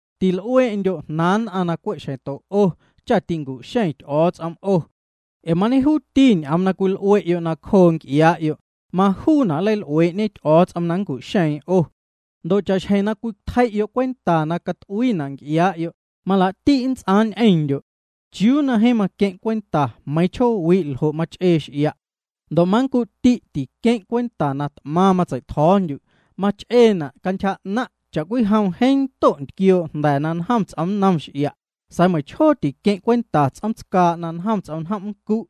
’Til'uee'ndyo' jnaaⁿ nn'aⁿ na cwe' xjeⁿto 'o cha ticu'xeⁿ Ty'o̱o̱ts'om 'o. Ee mañejuuti ñ'oom na cwil'ue'yo' nacjoo nc'iaa'yo', majuuna' nleil'uee'ñe Ty'o̱o̱ts'om na nncu'xeⁿna' 'o. Ndo' cha'xjeⁿ na cwitjei'yo' cwenta na cat'uiina' nc'iaa'yo', malaa'ti' nnts'aaⁿ ñ'eⁿndyo'. ¿Chiuu na jeeⁿ maqueⁿ' cwenta meiiⁿ chjoowi' ljo' mach'ee x'ia'? Ndo' manncu'ti' tiqueⁿ' cwenta na t'maⁿ matsei'tjo̱o̱ndyu'. Mach'eena' cantyja 'naⁿ' cha'cwijom jeeⁿ ndo' ntquioo' jnda̱ na njom ts'omnnom x'ia', sa̱a̱ meiⁿchjoo tiqueⁿ' cwenta ts'oom tscaa' na njom ts'omnjom' nncu'.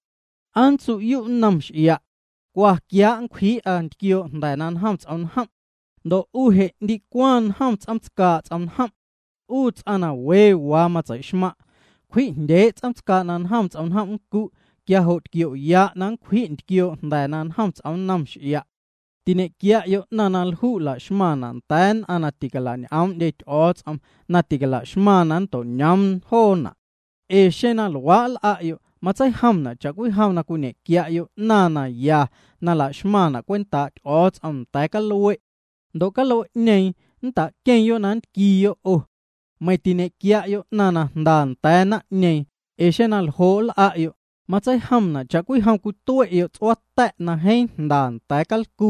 ¿Aa nntsu'yu' nnom x'ia': “Cwa, quiaa' na nncwjii'a ntquioo' jnda̱ na njom ts'omnjom'”? Ndo' 'u je' ndicwaⁿ njom ts'oom tscaa' ts'omnjom'. 'U ts'aⁿ na we waa na matseixmaⁿ' cwji'jndyee' ts'oom tscaa' na njom ts'omnjom' nncu' quia jo' tquio'ya' na nncwji' ntquioo' jnda̱ na njom ts'omnnom x'ia'. ’Tiñe'quia'yo' 'naⁿ na lju' la'xmaⁿna' nda̱a̱ nn'aⁿ na ticala'ñ'oom'ndye Ty'o̱o̱ts'om na ticala'xmaⁿ na nnto'ñoom joona'. Ee xeⁿ na luaa' nl'a'yo' matseijomna' cha'cwijom cwiñe'quia'yo' 'naⁿ na ya na la'xmaⁿna' cwentaa' Ty'o̱o̱ts'om nda̱a̱ calue'. Ndo' calue'ñeeⁿ nnta'queⁿyo' na nntquiiyo' 'o. Meiⁿ tiñe'quia'yo' 'naⁿ na jnda nda̱a̱ naⁿ'ñeeⁿ, ee xeⁿ na ljo' nl'a'yo', matseijomna' cha'cwijom cwitue'yo' ts'uaa ta̱' na jeeⁿ jnda nda̱a̱ calcu.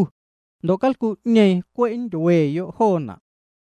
Ndo' calcu'ñeeⁿ cwe' nntyueyo' joona'.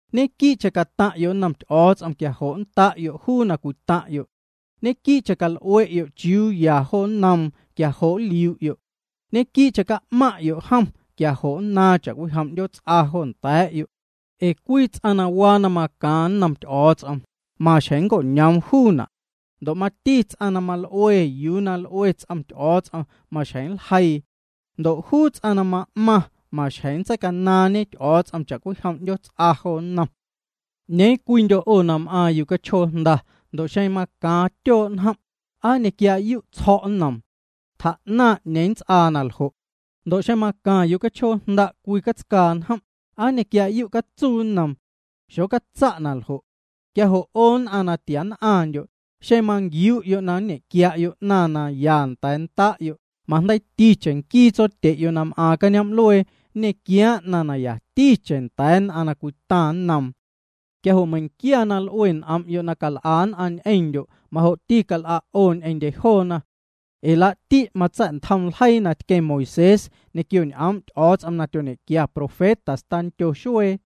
’Ñequii'cheⁿ cataⁿ'yo' nnom Ty'o̱o̱ts'om quia jo' nnda'yo' juu na cwitaⁿ'yo'. Ñequii'cheⁿ cal'ue'yo' chiuuya jo nnoom quia jo' nliu'yo'. Ñequii'cheⁿ ca'maⁿ'yo' jom quia jo' nnaaⁿ cha'cwijom 'ndyoots'a jo nda̱a̱'yo'. Ee cwii ts'aⁿ na waa na macaaⁿ nnom Ty'o̱o̱ts'om, maxjeⁿ nnco'ñoom juuna'. Ndo' mati ts'aⁿ na mal'ue yuu na l'ue ts'om Ty'o̱o̱ts'om, maxjeⁿ nljeiiⁿ. Ndo' juu ts'aⁿ na ma'maⁿ, maxjeⁿ nntseicanaaⁿñe Ty'o̱o̱ts'om cha'cwijom 'ndyoots'a jo nnom. ’¿'Ñeeⁿ cwiindyo' 'o na m'aaⁿ yucachjoo jnda, ndo' xeⁿ macaaⁿ tyoo' njom', aa nñequiaa'yu' tsjo̱' nnoom? Tjaa'naⁿ 'ñeeⁿ nnts'aa na ljo'. Ndo' xeⁿ macaⁿ yucachjoo jnda' cwii catscaa njom', ¿aa nñequiaa'yu' catsuu nnoom? Xocatsa' na ljo'. Quia jo' 'o nn'aⁿ na tia nn'aⁿndyo', xeⁿ manquiu'yo' na nñe'quia'yo' 'naⁿ na ya nda̱a̱ nda'yo', majndeiiticheⁿ nquii Tsotye'yo' na m'aaⁿ cañoom'luee nñequiaaⁿ 'naⁿ na yaticheⁿ nda̱a̱ nn'aⁿ na cwitaⁿ nnoom. ’Quia jo' meiⁿnquia na l'ue n'om'yo' na cal'a nn'aⁿ ñ'eⁿndyo' majo'ti cal'a' 'o ñ'eⁿndye joona. Ee laa'ti' matsa̱'ntjom ljeii na tqueⁿ Moisés ñequio ñ'oom' Ty'o̱o̱ts'om na tyoñe'quia profetas tandyo xuee.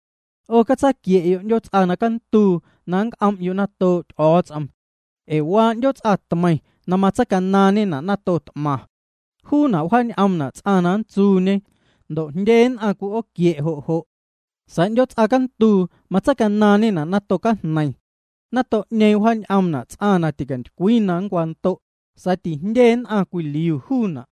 ’'O catsaquie'yo' 'ndyoots'a cantuu na nnc'om'yo' natoo' Ty'o̱o̱ts'om. Ee waa 'ndyoots'a tmeiⁿ na matseicanaaⁿñena' nato t'maⁿ. Juuna' wjaañ'oomna' ts'aⁿ na nntsuuñe ndo' jndye nn'aⁿ cwi'ooquie' jo' jo'. Sa̱a̱ 'ndyoots'a cantuu matseicanaaⁿñena' nato cajneiⁿ. Nato'ñeeⁿ wjaañ'oomna' ts'aⁿ na ticantycwii na nncwando' sa̱a̱ tijndye nn'aⁿ cwiliu juuna'.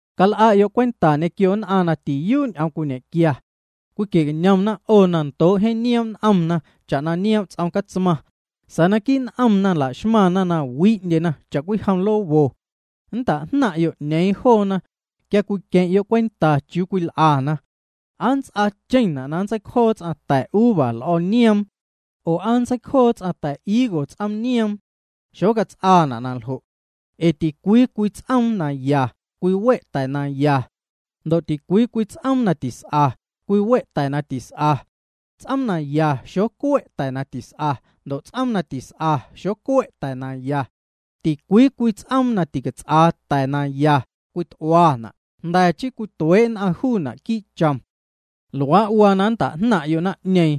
’Cal'a'yo' cwenta ñequio joo nn'aⁿ na tiyuu' ñ'oom cwiñe'quia. Cwiquie'cañomna 'o na ndoo' jeeⁿ nioom' n'omna cha'na nioom' ts'om catsmaⁿ sa̱a̱ naquii' n'omna laxmaⁿna na wi'ndyena cha'cwijom lobo. Nnta'jnaⁿ'yo' 'ñeeⁿ joona quia cwiqueⁿ'yo' cwenta chiuu cwil'ana. ¿Aa nnts'aacheⁿna' na nntseicjoo ts'aⁿ ta̱uva l'o̱o̱nioom? Oo ¿aa nntseicjoo ts'aⁿ ta̱higos ts'oom nioom? Xocats'aana' na ljo'. Ee ticwii cwii ts'oom na ya, cwiwe' ta̱ na ya, ndo' ticwii cwii ts'oom na tis'a, cwiwe' ta̱ na tis'a. Ts'oom na ya xocue' ta̱ na tis'a, ndo' ts'oom na tis'a xocue' ta̱ na ya. Ticwii cwii ts'oom na ticats'aa ta̱ na ya, cwit'uana', jnda̱ chii cwituee' nn'aⁿ juuna' quii' chom. Luaa' waa na nnta'jnaⁿ'yo' naⁿ'ñeeⁿ,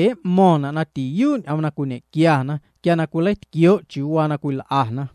ee m'mo̱ⁿna' na tiyuu' ñ'oom na cwiñe'quiana quia na nleitquioo' chiuu waa na cwil'ana.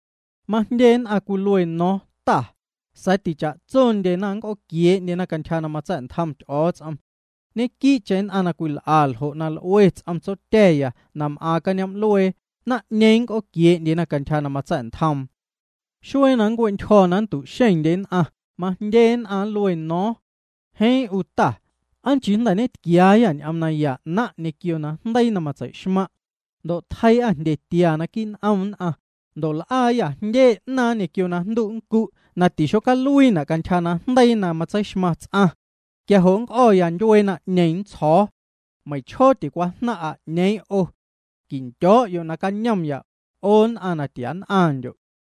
’Majndye nn'aⁿ cwilue nno̱o̱ⁿ Ta, sa̱a̱ ticha'tsondyena nnc'ooquiee'ndyena cantyja na matsa̱'ntjom Ty'o̱o̱ts'om. Ñequii'cheⁿ joo nn'aⁿ na cwil'a ljo' na l'ue ts'om Tsotya̱ya na m'aaⁿ cañoom'luee, naⁿ'ñeeⁿ nnc'ooquiee'ndye cantyja na matsa̱'ntjoom. Xuee na nncue'ntyjo̱ na nntu'xeⁿndye nn'aⁿ, majndye nn'aⁿ nluena no̱o̱ⁿ: “Jeeⁿ 'u Ta, ¿aa nchii jnda̱ tquiaayâ ñ'oom naya 'naⁿ' ñequio najndeii na matsei'xmaⁿ' ndo' tjeii'â jndyetia naquii' n'om nn'aⁿ, ndo' l'aayâ jndye 'naaⁿ ñequio najndu' nncu' na tixocaluiina' cantyja najndeii na matseixmaⁿ ts'aⁿ?” Quia jo' nnc'o̱ya ndyuee naⁿ'ñeeⁿ, nntsjo̱o̱: “Meiⁿchjoo ticwajnaⁿ'a 'ñeeⁿ 'o. Quindyo̱'yo' nacañomya, 'o nn'aⁿ na tia nn'aⁿndyo'.”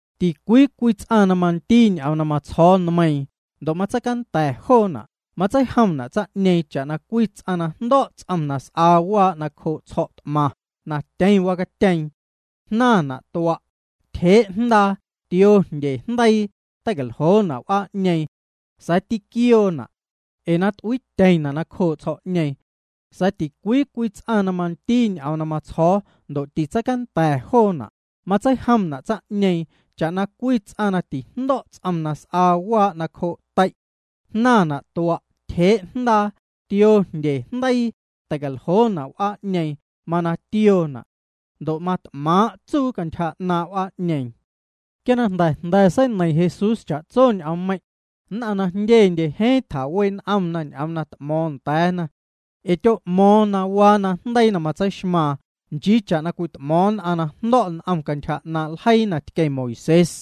’Ticwii cwii ts'aⁿ na mandii ñ'oom na matsjo̱o̱ nmeiiⁿ ndo' matseicanda̱ joona', matseijomna' tsaⁿ'ñeeⁿ cha'na cwii ts'aⁿ na jndo̱' ts'om na s'aa waa' nacjoo' tsjo̱'t'maⁿ na tyeⁿ wacatyeeⁿ. Jnaⁿna' tua', tyjee' jndaa, tioo jndye jndeii, teicaljoona' w'aa'ñeeⁿ, sa̱a̱ tiquioona' ee na t'uiityeⁿna' nacjoo' tsjo̱'ñeeⁿ. Sa̱a̱ ticwii cwii ts'aⁿ na mandii ñ'oom na matsjo̱o̱ ndo' titseicanda̱ joona', matseijomna' tsaⁿ'ñeeⁿ cha'na cwii ts'aⁿ na tijndo̱' ts'om na s'aa waa' nacjoo' tei'. Jnaⁿna' tua', tyjee' jndaa, tioo jndye jndeii, teicaljoona' w'aa'ñeeⁿ, mana tioona'. Ndo' mat'maⁿ tsuu cantyja 'naaⁿ' w'aa'ñeeⁿ. Quia na jnda̱ jnda̱ seineiⁿ Jesús cha'tso ñ'oommeiⁿ', nn'aⁿ na jndyendye jeeⁿ tjawee' n'omna ñ'oom na t'mo̱o̱ⁿ nda̱a̱na. Ee tyo'mo̱o̱ⁿ na waa najndeii na matseixmaaⁿ, nchii cha'na cwit'mo̱o̱ⁿ nn'aⁿ na jndo̱' n'om cantyja 'naaⁿ' ljeii na tqueⁿ Moisés.